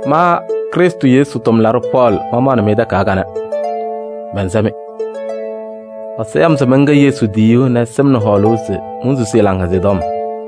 Ma Krɩstʋ Yesu tʋmlaɖʋ Pɔɔlɩ, mamaɣnɩ-mɩ takayaɣ kanɛ, mɛnsɛ-mɩ. Ɛsɔ ya-m se mɛnkɛ Yesu tiyiyu nɛ ɛsɩ-m nɛ hɔɔlʋʋ se monsusi ɛ-Laŋhɛzɩyɛ Tɔm.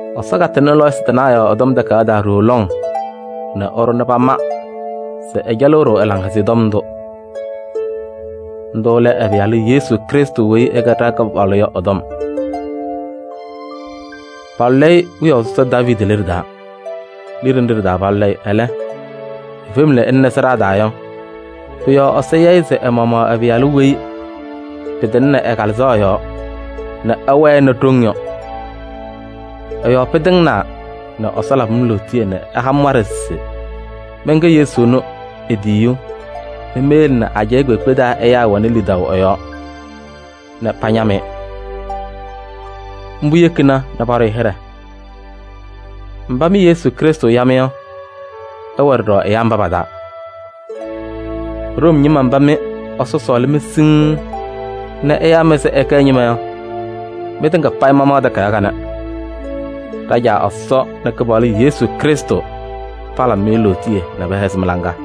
Ɛsɔ katɩŋnɩ lɔɔyɩsɩ tɩnaa yɔɔ ɛ-Tɔm Takayaɣ taa ɖooo lɔŋ nɛ ɛɖʋ nɛ pama se ɛcɛlɩɣ-ɖʋ Laŋhɛzɩyɛ Tɔm ndʋ. Ndʋ lɛ ɛ-Pɩyalʋ Yesu Krɩstʋ weyi ɛkɛ ɖa-Kɩpaɣlʋ yɔ ɛ-tɔm. Palʋlɩ-ɩ wiyaʋ sɔsɔ Daaviidi liɖe taa. Liɖe nɖɩ ɖɩ-taa palʋlɩ-ɩ, ɛlɛ, efem nɛ ɛlɩnɩ sɩɖaa taa yɔ, pʋ-yɔɔ Ɛsɔ ya-ɩ se ɛ-maɣmaɣ ɛ-Pɩyalʋ weyi pɩtɩŋnɩ ɛ-Kalɩzaɣ yɔɔ nɛ ɛwɛnɩ ɖoŋ yɔ. Ɛ-yɔɔ pɩtɩŋnaa nɛ Ɛsɔ labɩ-m lootiye nɛ ɛha-m waɖɛ se mɛnkɛ Yesu ɛnʋ e-tiyiyu nɛ meyele nɛ ajɛɛ kpeekpe taa ɛyaa wɛnɩ lidaʋ ɛ-yɔɔ nɛ pañam-ɩ. Mbʋ yekina nɛ paɖʋ-ɩ hɩɖɛ. Mba mɩ Yesu Krɩstʋ ya-mɩ yɔ, ɩwɛ ɖɔɖɔ ɛyaa mba pa-taa. Room ñɩma mba mɩ Ɛsɔ sɔɔlɩ-mɩ siŋŋ nɛ ɛyaa-mɩ se ɩkɛ ɛ-ñɩma yɔ, mɩtɩŋa payɩ mamaɣ takayaɣ kanɛ. Ɖa-Caa Ɛsɔ nɛ Kɩpaɣlʋ Yesu Krɩstʋ palabɩ-mɩ lootiye nɛ pɛhɛzɩ mɩ-laŋa!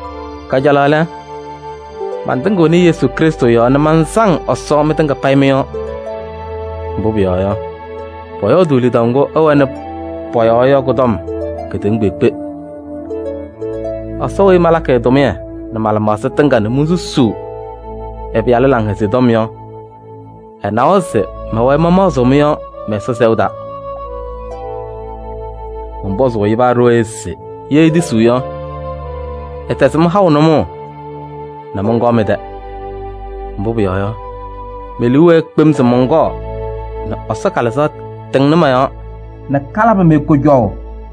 Kajalaɣ lɛ, mantɩŋɩɣnɩ Yesu Krɩstʋ yɔɔ nɛ mansaŋ Ɛsɔ mɩtɩŋa payɩ mɩ-yɔɔ. Mbʋ pʋyɔɔ yɔ, pɔyɔɔdʋʋ lidaʋ ŋgʋ ɩwɛnɩ pɔ-yɔɔ yɔ kʋ-tɔm kedeŋa kpeekpe. Ɛsɔ weyi malakɩ ɛ-tʋmɩyɛ nɛ ma-lɩmaɣza tɩŋa nɛ monsusuu ɛ-Pɩyalʋ Laŋhɛzɩyɛ Tɔm yɔ, ɛnawa se mɛwɛɛ mamaɣzɩɣ mɩ-yɔɔ mɛ-Ɛsɔ sɛʋ taa. Mɔnpɔzʋʋ-ɩ paa ɖooye se ye etisiɣ yɔ, ɛtɛzɩ-m haʋ nʋmɔʋ nɛ mɔnkɔɔ mɩ-tɛ. Mbʋ pʋyɔɔ yɔ, me-liu wɛɛ kpem se mɔnkɔɔ nɛ Ɛsɔ Kalɩzaɣ tɩŋnɩ mɔ-yɔɔ nɛ kalabɩ-mɩ kʋjɔʋ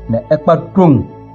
nɛ ɩkpa ɖoŋ.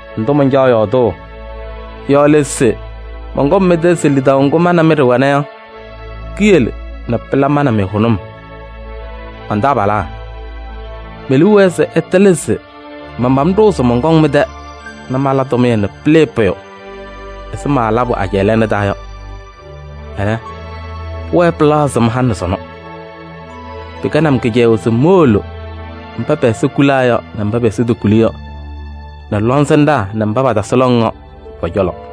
Ndʋ mancaɣ yɔɔdʋʋ yɔ lɛ se mɔnkɔŋ mɩ-tɛ se lidaʋ ŋgʋ ma nɛ mɩ ɖɩwɛna yɔ, kiyele nɛ pɩla ma nɛ mɩ hʋnʋm. Man-taabalaa! Me-liu wɛɛ se ɩtɩlɩ se manpam ɖʋʋ se mɔnkɔŋ mɩ-tɛ nɛ mala tʋmɩyɛ nɛ pɩlɩɩ pʋyʋ ɛzɩ malabʋ ajɛɛ lɛɛna taa yɔ. Ɛlɛ, pʋwɛɛ pɩlaɣzɩɣ-m halɩ nɛ sɔnɔ. Pɩkɛnɩ-m kɩcɛyʋʋ se mowolo mba pɛ-ɛza kulaa nɛ mba pɛ-ɛza tokuli yɔ, nɛ lɔŋsɩnɖaa nɛ mba patasɩ lɔŋ yɔ pɔ-cɔlɔ.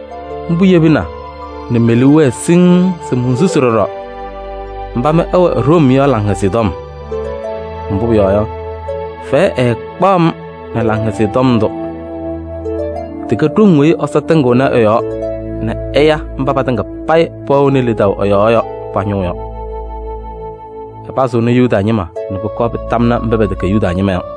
Mbʋ yebina nɛ me-liu wɛɛ siŋŋ se monsusi ɖɔɖɔ mba mɩ ɩwɛ Room yɔ Laŋhɛzɩyɛ Tɔm. Mbʋ pʋyɔɔ yɔ, fɛyɛ ɛɛkpaɣ-m nɛ Laŋhɛzɩyɛ Tɔm ndʋ: tɩkɛ ɖoŋ weyi Ɛsɔ tɩŋɩɣnɩ ɛ-yɔɔ nɛ ɛya mba patɩŋa payɩ pɛwɛɣnɩ lidaʋ ɛ-yɔɔ yɔ pa-ñʋʋ yɔ. Ɛpazɩɣnɩ Yuda ñɩma nɛ pʋkɔɔ pɩtamnɩ mba pɛtɛkɛ Yuda ñɩma yɔ.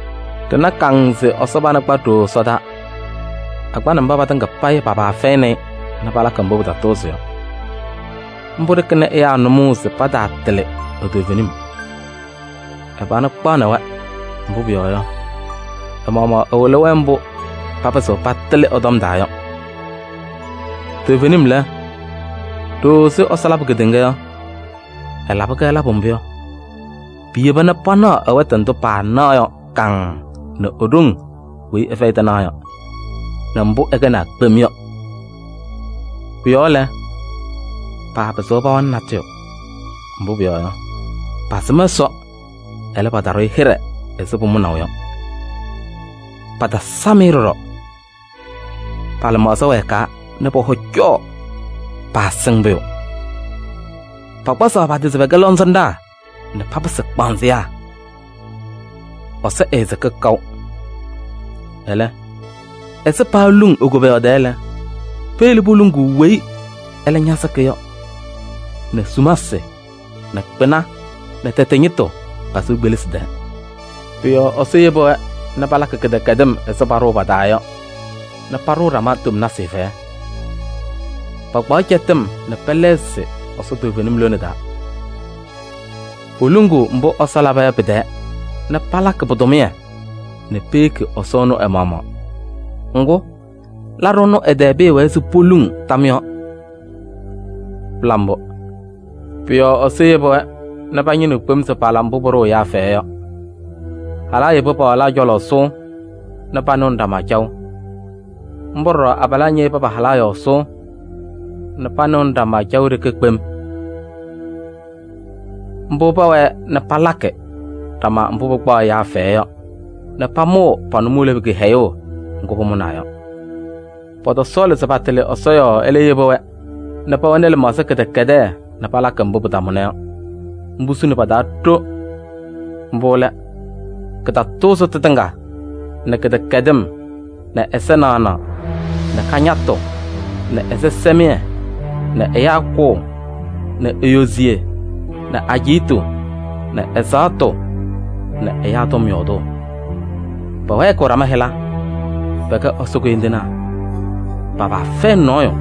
Ɖɩna kaŋŋ se Ɛsɔ pana kpa ɖooo ɛsɔdaa. Akpanɩ mba patɩŋa payɩ pa-paa fɛyɩnɩ-ɩ nɛ palakɩ mbʋ pɩtatʋʋzɩ yɔ. Mbʋ ɖɩkɩnɩ ɛyaa nʋmɔʋ se pataatɩlɩ e-toovenim. Ɛ-pana kpaɣnɩ-wɛ, mbʋ pʋyɔɔ yɔ, ɛ-maɣmaɣ ɛwɩlɩ-wɛ mbʋ papɩzɩɣ patɩlɩ ɛ-tɔm taa yɔ. Toovenim lɛ, ɖooo ɛzɩ Ɛsɔ labʋ kedeŋa yɔ, ɛlabɩ-kɛ labʋ mbʋ yɔ, piyeba nɛ panaɣ ɛ-wɛtʋ ndʋ paanaɣ yɔ kaŋŋ nɛ e-ɖoŋ weyi ɛfɛyɩ tɩnaɣ yɔ nɛ mbʋ ɛkɛnaa kpem yɔ. Pʋ-yɔɔ lɛ, paapɩzɩɣ pawanɩ natʋyʋ. Mbʋ pʋyɔɔ yɔ, pasɩm Ɛsɔ, ɛlɛ, pataɖʋ-ɩ hɩɖɛ ɛzɩ pʋmʋnaʋ yɔ, patasam-ɩ ɖɔɖɔ. Pa-lɩmaɣza wɛɛkaa nɛ pɔ-hɔ cɔɔ, paasɩŋ pʋyʋ. Pakpazaɣ pa-tɩ se pɛkɛ lɔŋsɩnɖaa nɛ papɩsɩ kpaanzɩyaa. Ɛsɔ ɛɛsɩkɩ kaʋ, ɛlɛ, ɛzɩ paaluŋ e-koboyaɣ tɛɛ lɛ, peyele poluŋuu ɛyʋ weyi ɛlɛ ñasɩkɩ yɔ nɛ sumasɩ nɛ kpɩna nɛ tɛtɛ ñɩtʋ pa-sɩʋ kpelisi tɛɛ. Pʋ-yɔɔ Ɛsɔ yebi-wɛ nɛ palakɩ kɩdɛkɛdɩm ɛzɩ paɖʋʋ pa-taa yɔ nɛ paɖʋʋ ɖama tomnasɩ fɛyɛ. Pakpaɣ cɛtɩm nɛ pɛlɛɣzɩ Ɛsɔ toovenim lone taa. Poluŋuu mbʋ Ɛsɔ laba yɔ pɩ-tɛɛ nɛ palakɩ pɩ-tʋmɩyɛ nɛ peyeki Ɛsɔ ɛnʋ ɛ-maɣmaɣ. Ŋgʋ, laɖʋ ɛnʋ ɛ-tɛɛ pɩɩwɛɛ se poluŋ tam yɔɔ. Pɩla mbʋ! Pʋ-yɔɔ Ɛsɔ yebi-wɛ nɛ pañɩnɩɣ kpem se pala mbʋ pʋɖʋʋ ɛyaa fɛyɛ yɔ: halaa yebi pa-walaa cɔlɔ sʋʋ nɛ panɩɣnɩ ɖama caɣʋ. Mbʋ ɖɔɖɔ abalaa ñeyebi pa-halaa yɔɔ sʋʋ nɛ panɩɣnɩ ɖama caʋ ɖeke kpem. Mbʋ pɛwɛɛ nɛ palakɩ ɖama mbʋ pɩkpaɣ ɛyaa fɛyɛ yɔ nɛ pamʋʋ pa-nʋmɔʋ lebu kɩhɛyʋʋ ŋgʋ pʋmʋnaa yɔ. Pɔtɔsɔɔlɩ se patɩlɩ Ɛsɔ yɔɔ, ɛlɛ yebi-wɛ nɛ pɛwɛnɩ lɩmaɣza kɩdɛkɛdɛɛ nɛ palakɩ mbʋ pɩtamʋna yɔ. Mbʋ suni pa-taa ɖo. Mbʋ lɛ: kɩtatʋʋzɩtʋ tɩŋa nɛ kɩdɛkɛdɩm nɛ ɛza naɣnaɣ nɛ kañatʋ nɛ ɛzɩsɛmɩyɛ nɛ ɛyaa kʋʋ nɛ eyoziye nɛ ajiitu nɛ ɛzaɣtʋ nɛ ɛyaa tɔm yɔɔdʋʋ. Pɛwɛɛkɩɣ ɖama hɩla. Pɛkɛ Ɛsɔ koyindinaa, pa-paa fɛyɩnɩ nɔɔyʋ,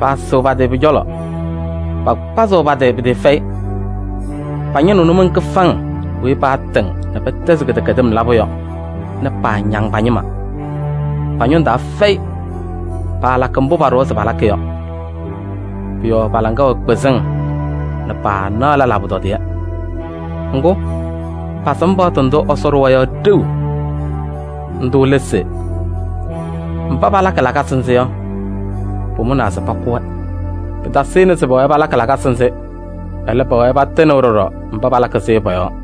paasɩɣ pa-tɩ pʋ-cɔlɔ, pakpazɩɣ pa-tɩ pɩtɩɩfɛyɩ. Pañɩnɩɣ nʋmɔŋ kɩfaŋ weyi patɩŋ nɛ pɛtɛzɩ kɩdɛkɛdɩm labʋ yɔ nɛ paañaŋ pa-ñɩma. Pa-ñʋŋ taa fɛyɩ, paalakɩ mbʋ paɖʋwa se palakɩ yɔ. Pʋ-yɔɔ pa-laŋa wɛ kpɩzɩŋ nɛ paanaɣ lɛlaa pʋtɔdɩyɛ. Ŋgʋ, pasɩm paɣtʋ ndʋ Ɛsɔ ɖʋwa yɔ ɖeu. Ndʋ lɛ se: mba palakɩ lakasɩ nzɩ yɔ, pʋmʋnaa se pakʋ-wɛ. Pɩtasɩnɩ se pɛwɛɛ palakɩ lakasɩ nzɩ, ɛlɛ, pɛwɛɛ patɩnɩɣ ɖɔɖɔ mba palakɩ-sɩ yɔ pɔ-yɔɔ.